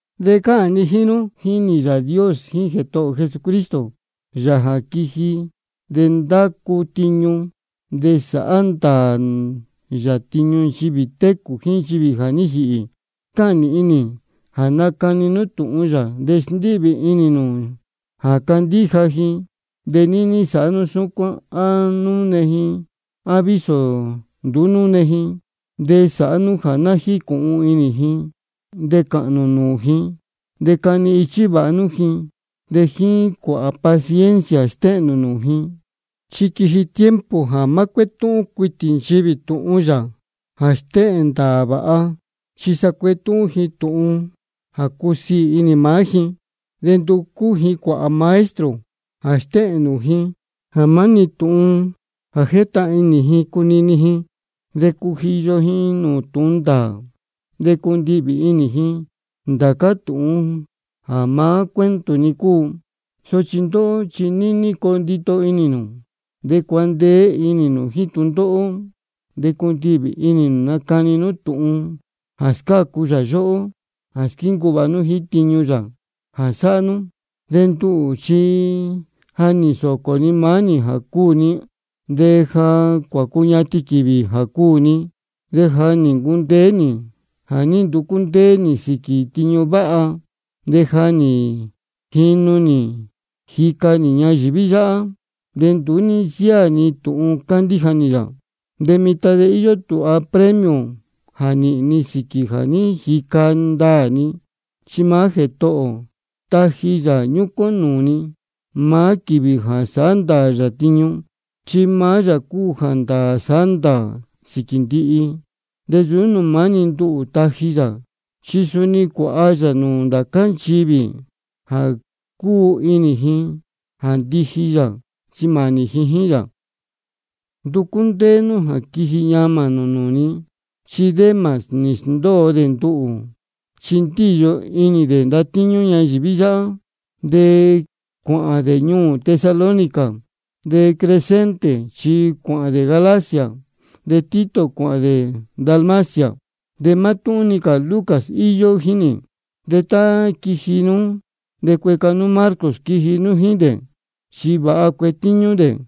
De cáhān ni jíín nú, jínī Yāā Dios jíín Jētohō ō Jesucristo, Yāā jā quiji de ndacu tiñu, de sāhá ndāā yā tiñu nchivī técū jíín nchivī jā ní jīhī. Cáhān nīhin nī jā nacani nú tūhun yā, de sndíhvī inī nū ji jā candíja ji. De níní sāhá nú súcuán á núne ji á vísō nduú núne ji. De sāhá nú jā ná jícūhun inī ji, de cāhān nū nūū ji, de cani ichí vāha nú ji, de jíín cuāhā paciencia stéhēn nū nūū ji. Chi quiji tiempo jā má cuétúhún cuitī nchivī tūhun yā jā stéhēn ndāā vāha, chi sa cuetúhún ji tūhun jā cúsiī inī maá ji, de nducú ji cuāhā maestro jā stéhēn nūū ji maá-ni tūhun jā jétahān inī ji cunini ji. De cujiyo ji nūū tūhun ndāā, de cundihvī inī ji ndācá tūhun jā maá cuento-ni cúu. Sochi ndóhó chi níní coo ndito inī nū, de cuandeé inī nū jíín tūndóhó, de cundihvī inī nū nacani nú tūhun jā scácu yā yóhó, de squíncuu vāha nú jíín tiñu yā jā sáhá nú. De nduhū chi ja nī nsōcō ni maá nī jā cuū ni, de ja cuācuñatin quīvī jā cuū ni. De ja nī ncundeé nī jā ní nducú ndéé nī sīquī tiñu váha, de ja nī jīnu nī jica nī ñayīví yáhá, de nduú ní nsiáā ni tūhun cándíja nī yā. De mitan ja íyó tūha premio jā nīhīn ni sīquī jā ní jica ndaā ni. Chi maá Jētohō ō taji yā ñúcuán nūū ni maá quīvī jā sāhá ndāā yā tiñu, chi maá yā cúu jā ndāā sándāā sīquī ndihi. De nsūú nūū maá-ni nduhū taji yā, chi suni cuāha yā nūū ndācá nchivī jā cúu inī ji jā ndiji yā chi mānī ji jíín yā. Nducú ndéé nú jā quiji ñamā nū nūū ni. Chi Demas nī sndóo dē nduhū, chi ndíyo inī dē ndatíñú ñayīví yáhá, de cuāhān dē ñuū Tesalónica. De Crescente chi cuāhān de Galacia, de Tito cuāhān dē Dalmacia. De mátúhún-ni cā Lucas íyó jíín nī. De tá quiji nú, de cueca nú Marcos quiji nú jíín dē, chi vāha cuetíñú dē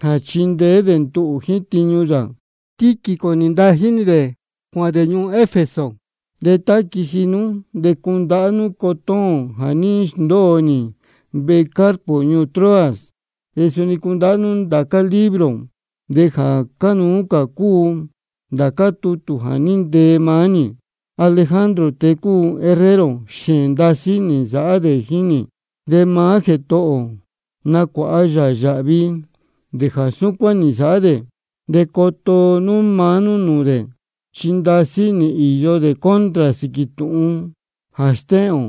jā chindeé dē nduhū jíín tiñu yā. Tíquico nī ntají nī dē cuāhān dē ñuū Efeso. De tá quiji nú de cundahá nú cotón jā ní sndóo nī vehe Carpo ñuū Troas. De suni cundahá nú ndācá libro, de jā cánuú cā cúu ndācá tutū jā ní ntee maá nī. Alejandro, tēe cúu herrero, xēēn ndasí nī nsāhá dē jíín nī. De maá Jētohō ō nacuāha yā yāhvi dē jā súcuán nī nsāhá dē. De coto nú maá nú nūū dē, chi ndasí nī īyo dē contra sīquī tūhun jā stéhēn ō.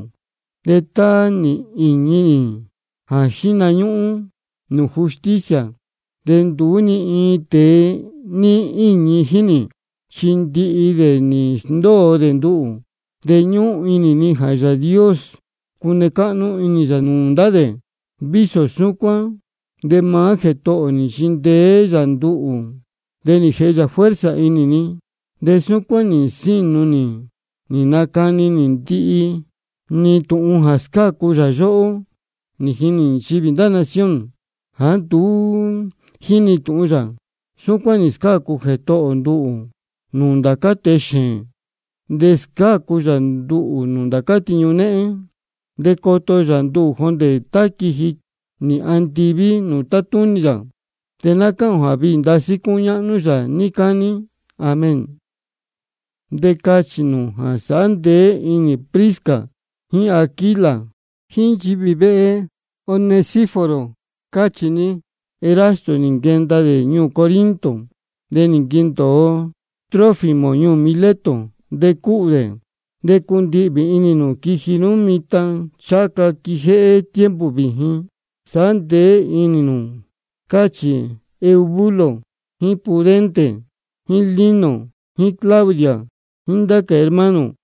De tá nī īñi nī jā xíhna ñúhún nūū justicia, de nduú ni iin tēe ní íñi jíín nī, chi ndihi dē nī sndóo dē nduhū. De ñúhún inī ni jā Yāā Dios cune cáhnú inī yā nūū ndá dē. De vísō súcuán de maá Jētohō ō nī nchindeé yā nduhū, de nī jēhe yā fuerza inī ni, de súcuán nī nsínu nī nī nacani ndihi nī tūhun jā scácu yā yóhó, nī jini nchivī ndá nación jāá nduú jínī tūhun yā. Súcuán nī scácu Jētohō ō nduhū nūū ndācá tēe xēēn. De scácu cā yā nduhū nūū ndācá tiñu néhén, de coto yā nduhū jondē tá quīvi nī andiví nūū tátúnī yā. De ná cáhān ō jā viī ndasí cúñáhnú yā níí cání. Amén. De cachī nū jā sāhá ndeé inī Prisca jíín Aquila, jíín nchivī vehe Onesíforo, cáchī ni. Erasto nī nquendōo dē ñuū Corinto. De nī nquendōo Trófimo ñuū Mileto, de cúhū dē. De cundihvī inī nū quiji nú mitan ncháha ca quijéhé tiempo vījin. Sāhá ndeé inī nū, cáchī Eubulo jíín Pudente jíín Lino jíín Claudia jíín ndá cā hermano.